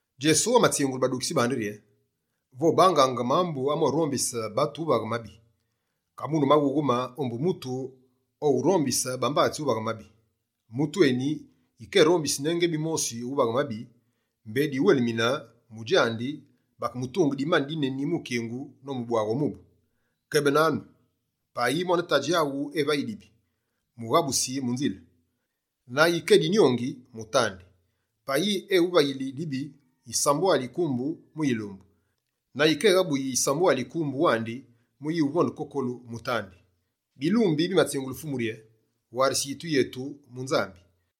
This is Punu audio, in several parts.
Djesu amatsingule badukitsi bandi rye: «Vobangaange mambu amorobisaange batu uvaghe mabi. Kamune maghughe-ma, ombu mutu owurombise bambatsi uvaghe mabi! Mutu eni, yike erombisi ne ngebi mosi uvaghe mabi, mbé dyuwelimine mu djandi bakemutunge dimani dineni mu kingu nomubwaghe o mubu. Kebenanu, payi mwane tadji aghu evayi dibi, mughabusi mu nzile. Na yike edinyongi, mutandi. Payi eghuvayili dibi yisambwali yi kumbu mu yilumbu, na yikéghabuyi yisambwali yi kumbu wandi mu uyuvonde kokolu, mutandi.» Bilumbi bimatsingule Fumu rye: «Warise yitu yetu mu Nzambi.»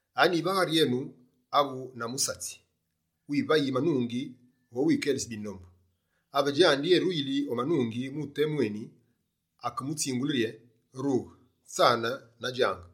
«Anyi, va ghari enu avu na musatsi, wivayi manungi vo wukelise bindombu, ave djandi eruyili o manungi, mu temu eni, akemutsingule rye: “Rughe, tsane na djange”?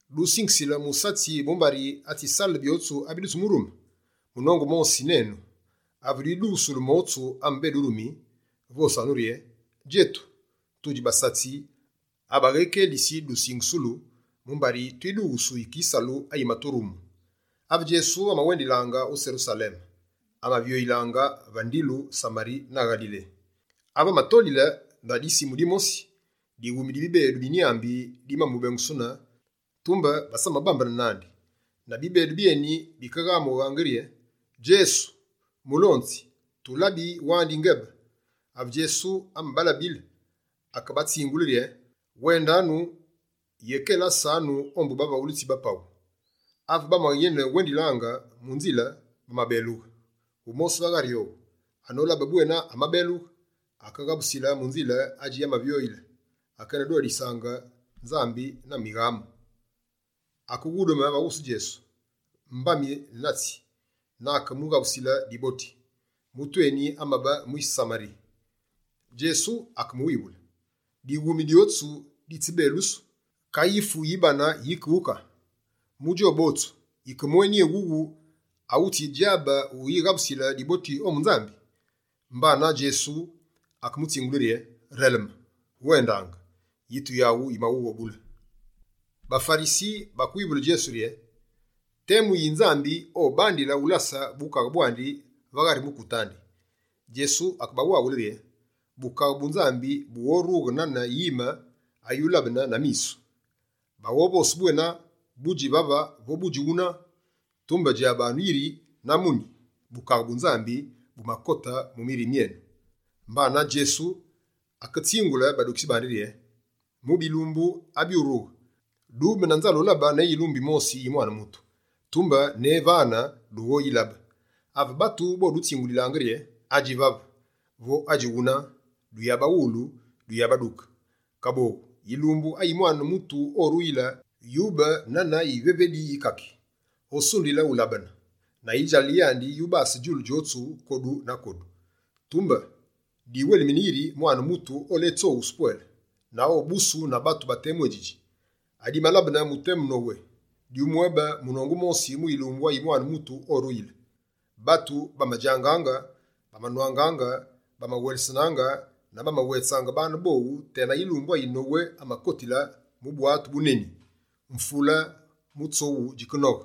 Dusingisile musatsi mumbari atsisale byotsu abidutsimurume? Munongu mosi nenu. Ave dwidughusulu motsu ame bédurumi, vosanu rye: “Djetu, tudji basatsi abaghékelisi dusingusulu, mumbari twidughusu yike yisalu ayimaturumu.”» Ave Djesu amawendilaange o Serusaleme, amavyolaange va ndilu Samari na Ngalile. Ave amatolile va dimbu dimosi, dighumi di bibedu bi nyámbi dimamubengusunu tumbe, basamabambene nandi. Na bibedu byeni bikeghamughe rye: «Djesu, Fumu, tulabi wandi yingebe!» Ave Djesu amabalabile, akebatsingule rye: «Wendanu, yekelasanu menu ombu bavaghulitsi ba paghu.» Ave bamayene wendilaange, mu nzile bamabelughe. Wumosi va ghari owu, anolabe bwena amabelughe, akeghabusile mu nzile adji amavyole, akenedodisaange Nzambi na mighamu. Akeghudume va wusu Djesu, mbami na tsi, na akemughabusile diboti. Mutu eni amabe mwise Samari. Djesu akemuwivule: «Dighumi dyotsu ditsibelusu. Ka yifu yi bane yike wuka? Mu djowu botsu, yike mweni éwuwu awutsidjabe uyighabusile diboti ombu Nzambi?» Mbanane Djesu akemutsingule rye: «Releme, wendange, yitu yaghu yimaghughobule.» BaFarisi bakewivule Djesu rye: «Temu yi, Nzambi obandile ulase bukaghe bwandi va ghari mukute andi?» Djesu akebawaghule rye: «Bukaghe bu Nzambi bughorughe nane yime ayulabene na misu. Baghovose bwena: “Budji vave vo budji wuna”. Tumbe djabanu yiri na muni, Bukaghe bu Nzambi bumakote mu mirime myenu.» Mbana Djesu aketsingule badukitsi bandi rye: «Mu bilumbu abyurughe, dube na nzale ulabe ne yilumbu yimosi yi Mwane Mutu, tumbe ne vane, dughoyilabe. Ave batu bodutsingulilaange rye: “Adji vave!” Vo: “Adji wuna!” Duyabawulu, duyabaduke. Kaboghu, yilumbu ayi Mwane Mutu oruyile, yube nane yivevedi yi kaki. Osundile ulabene, na yidjalale yandi yubase djulu djotsu kodu na kodu. Tumbe, diwelimine yiri Mwane Mutu oletsoghusu pwele, na obusu na batu ba temu édjidji. Adimalabene mu temu Nowe, dyumwébe munongu mosi mu yilumbu ayi Mwane Mutu oruyile. Batu bamadjangaange, bamanwangaange, bamawelesenaange na bamawetsaange baane bowu tena yilumbu ayi Nowe amakotile mu bwatu buneni. Mvule mutsoghu djikenoghe,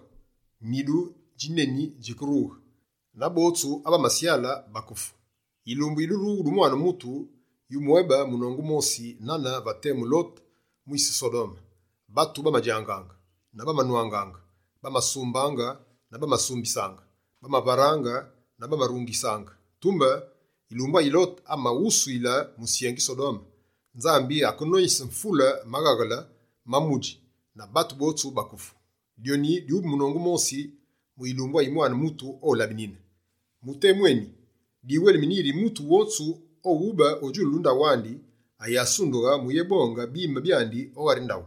nidu djineni djikerughe na botsu abamasyale bakefu. Yilumbu yi durughulu du Mwane Mutu, yumwébe munongu mosi nane va temu Lote mwise Sodome. Batu bamadjangaange na bamanwangaange; bamasumbaange na bamasumbisaange; bamavaraange na bamarungisaange. Tumbe yilumbu ayi Lote amaghusuyile musyengi Sodome, Nzambi akenoyise mvule maghaghele ma mudji na batu botsu bakefu. Dyoni dyube munongu mosi mu yilumbu ayi Mwane Mutu olabenine. Mu temu eni, diwelimine yiri mutu wotsu owube o djulu ndaghu andi, ayasundughe mu uyébonge bime byandi o ghari ndaghu.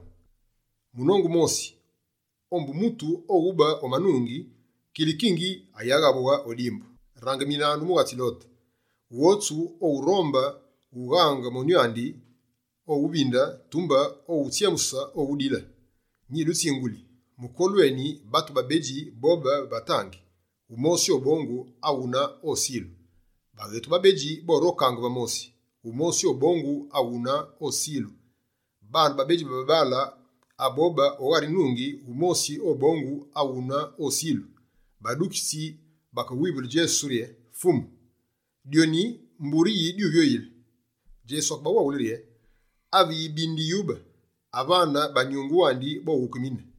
Munongu mosi ombu mutu owube o manungi, kilikingi ayaghabughe o dimbu. Rangiminanu mughatsi Lote! Wotsu owuronde ughaghe monyu andi, owuvinde; tumbe owughutsyemuse, owudile. Nyidutsinguli, mukolu eni, batu babedji bobe va tangi: wumosi obongu, awune osilu. Baghetu babedji borokaange va mosi, wumosi obongu, awune osilu. [ Babaale babedji abobe o ghari nungi, wumosi obongu, awune osilu.]» Badukitsi bakewivule Djesu rye: «Fumu, dyoni mbure yi dyuvyoyile?» Djesu akebawaghule rye: «Ave yibindi yube, avane banyunge wandi boghukemine.»